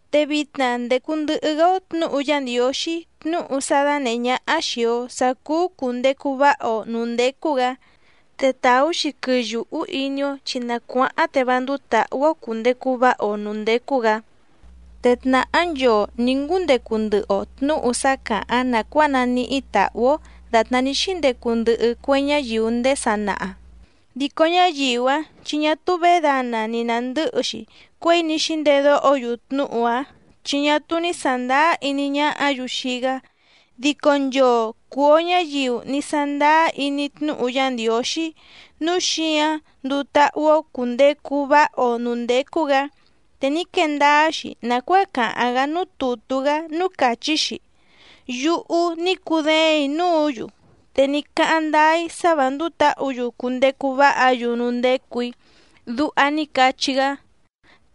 Te vitna ndècu ndɨhɨ‑gá‑ó tnǔhu Yá Ndiǒxí tnúhu sá dánèhé ñáhá xìi‑o sá cúú cùndecu váha‑o nǔú ndécú‑gǎ, te tàú‑xi quɨyùhú iní‑ó chi na cuáháⁿ te vá ndúú tǎhú‑ó cùndecu váha‑o nǔú ndécú‑gǎ. Te tnàhá nchoo nǐ ngúndecu ndɨhɨ‑o tnǔhu sá càháⁿ nàcuáa naníhí tàhú‑ó dàtná ní xíndecu ndɨhɨ cue ñáyiu ndéé sanaha, dico ñáyiu‑áⁿ chi ñá túú vědana ni nàndɨ́hɨ‑xi cuěi ní xíndedóho‑yu tnúhu‑áⁿ chi ñá túú ní sàndáá iní ñáhǎ‑yu xii‑gá. Dico nchoo cùu‑o ñáyiu ní sándáá iní tnúhu Yá Ndiǒxí, núu xíǎⁿ nduu táhú‑ó cùndecu váha‑o nǔú ndécú‑gǎ, te ní quee ndáá‑xi nàcuáa càháⁿ‑gá núú tùtú‑gá núú càchí‑xi: Yúhú ní cudéèⁿ‑í núǔ‑yu, te ní cáháⁿ ndáá‑í sá vǎ ndúú tǎhǔ‑yu cundecu váha‑yu núú ndécù‑í. Duha ní cachí‑gá.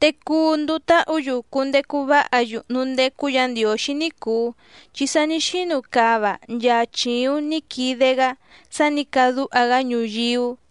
Te cuu nduu táhǔ‑yu cundecu váha‑yu núú ndécú Yǎ Ndiǒxí ní cùu, chi sa ní xínu cava nchaa chìuⁿ ní quide‑gá sá nǐ cadúha‑gá ñuyíú.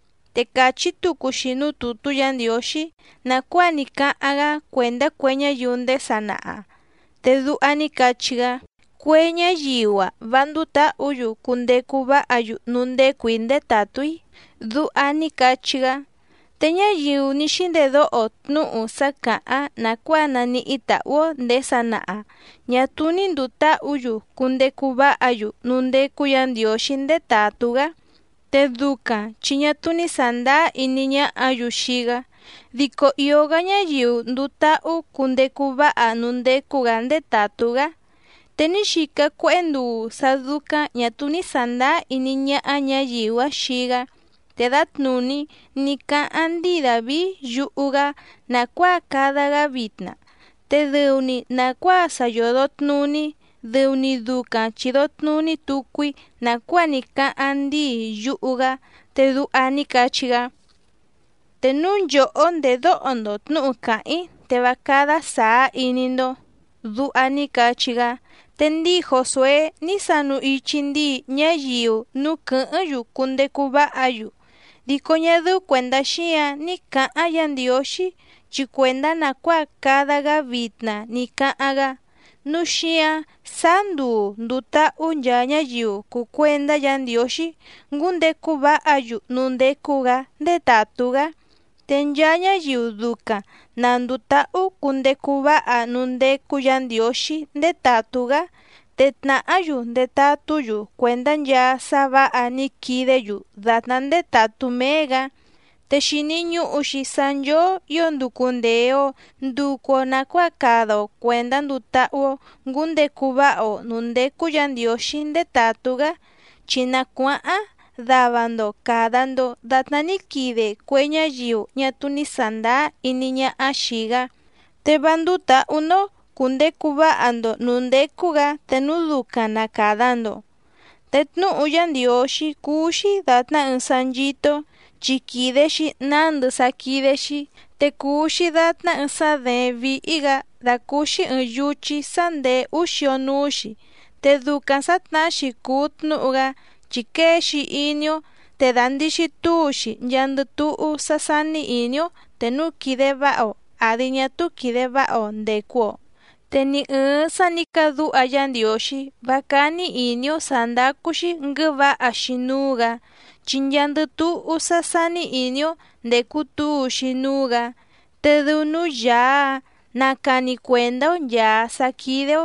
Te càchí tucu‑xi núú tùtú Yǎ Ndiǒxí nàcuáa ní cáháⁿ‑gá cuèndá cue ñáyiu ndéé sanaha, te duha ní cachí‑gá: Cue ñáyiu‑a vá ndúú tǎhǔ‑yu cundecu váha‑yu núú ndécù‑í ndétàtú‑í. Duha ní cachí‑gá. Te ñáyiu ní xíndedóho tnúhu sá càháⁿ nàcuáa naníhí tàhú‑ó ndèé sanaha, ñá túú ní ndùu táhǔ‑yu cundecu váha‑yu núú ndécú Yǎ Ndiǒxí ndétàtú‑gá, te ducaⁿ chi ñá túú ní sàndáá iní ñáhǎ‑yu xii‑gá, dico ìó‑gá ñáyiu nduu táhú cundecu váha núú ndécú‑gǎ ndétàtú‑gá. Te ní xica cuéhé nduu sá dúcáⁿ ñà túú ní sàndáá iní ñáhá ñǎyiu‑áⁿ xii‑gá, te dǎtnùní ní cáháⁿ ndíi Dàvií yuhu‑gá nàcuáa cada‑gá vitna, te dɨu‑ni nàcuáa sa yòdo tnuní dɨu‑ni ducaⁿ chìdo tnuní tucu‑í nàcuáa ní cáháⁿ ndíi yuhu‑gá, te duha ní cachí‑gá: Te núu nchòhó ndèdóho‑ndo tnǔhu càháⁿ‑í te vá cádá sàá iní‑ndó. Duha ní cachí‑gá. Te ndíi Jòsué ní sanu ichi ndíi ñáyiu núú quɨ̀hɨ́ⁿ‑yu cundecu váha‑yu, dico ñá dɨ́ú cuèndá xíǎⁿ ní cǎháⁿ Yǎ Ndiǒxí, chi cuèndá nàcuáa cada‑gá vitna ní cáháⁿ‑gá. Núu xíǎⁿ sáá nduu ndùu táhú nchaa ñáyiu cùu cuendá Yǎ Ndiǒxí ngúndecu váha‑yu núú ndécú‑gǎ ndétàtú‑gá. Te nchaa ñáyiu ducaⁿ na ndùu táhú cundecu váha núú ndécú Yǎ Ndiǒxí ndétàtú‑gá, te tnàhá‑yu ndetatú‑yu cuèndá nchaa sá vǎha ní quidé‑yu dàtná ndétàtú méé‑gǎ. Te xìni ñuhu‑xi sá nchóó ǐo nducu ndèe‑o nducu‑o nacuáa cada‑o cuèndá nduu táhú‑ó ngǔndecu váha‑o nǔú ndécú Yǎ Ndiǒxí ndétàtú‑gá, chi na cuáháⁿ dava‑ndo càda‑ndo datná ní quide cue ñáyiu ñá túú ní sàndáá iní ñáhá xìi‑gá, te vá ndúú tǎhú‑ndó cùndecu váha‑ndo nǔú ndécú‑gǎ te núu ducaⁿ na càda‑ndo. Te tnúhu Yá Ndiǒxí cúú‑xí dàtná ɨɨⁿ sá nchító‑ó chi quìde‑xi nándɨ sá quídé‑xí, te cùu‑xi datná ɨɨⁿ sá děéⁿ víhí‑gǎ dàcúúxí ɨ̀ɨⁿ yuchí sá ndèé úú xio núú‑xi. Te ducaⁿ sǎtnahá‑xi cùu tnúhu‑gá chi quée‑xi iní‑ó, te dàndixi túu‑xi nchaandɨ túhú sá sání ìní‑ó te núu quìde váha‑o àdi ñá túú quìde váha‑o ndècu‑o. Te ni ɨ̀ɨⁿ sá nǐ cadúha Yá Ndiǒxí vá cání ìní‑ó sǎ ndácú‑xí nguɨ̌vǎha‑xi núú‑gǎ, chi nchaandɨ túhú sá sání ìní‑ó ndècu túu‑xi núú‑gǎ, te dɨu núú Yàá‑áⁿ na càni cuendá‑ó nchàa sá quídé‑ó.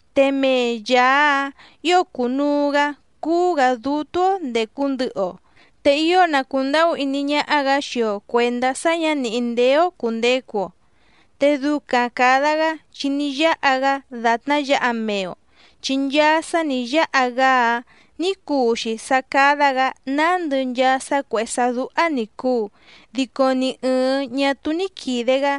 Te mee Yàá‑áⁿ ǐo cùnuu‑gá cúú‑gǎ dútú‑ó ndècu ndɨhɨ‑o, te ío na cùndahú iní ñáhá‑gǎ xii‑o cuèndá sá ñǎ nìhí ndéé‑ó cùndecu‑o. Te ducaⁿ càda‑gá chi ní yáha‑gá dàtná yǎha mee‑o, chi nchaa sá nǐ yáha‑gá‑áⁿ nǐ cuu‑xi sá cádá‑gǎ nándɨ nchaa sá cuèhé sá dúhá ní cùu dico ni ɨ̀ɨⁿ ñá túú ní quìde‑gá.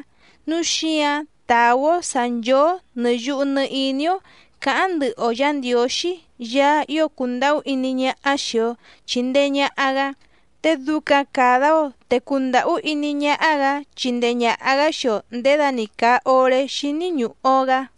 Núu xíǎⁿ tàú‑ó sǎ nchóó nɨ̀ yuhu nɨ iní‑ó cǎháⁿ ndɨhɨ‑o Yǎ Ndiǒxí Yaá ío cùndahú iní ñáhá xìi‑o chindee ñaha‑gá, te ducaⁿ càda‑o te cundàhú iní ñáhá‑gǎ chindee ñàha‑gá xii‑o nděda‑ni càa oré xíní ñùhu‑o‑gá.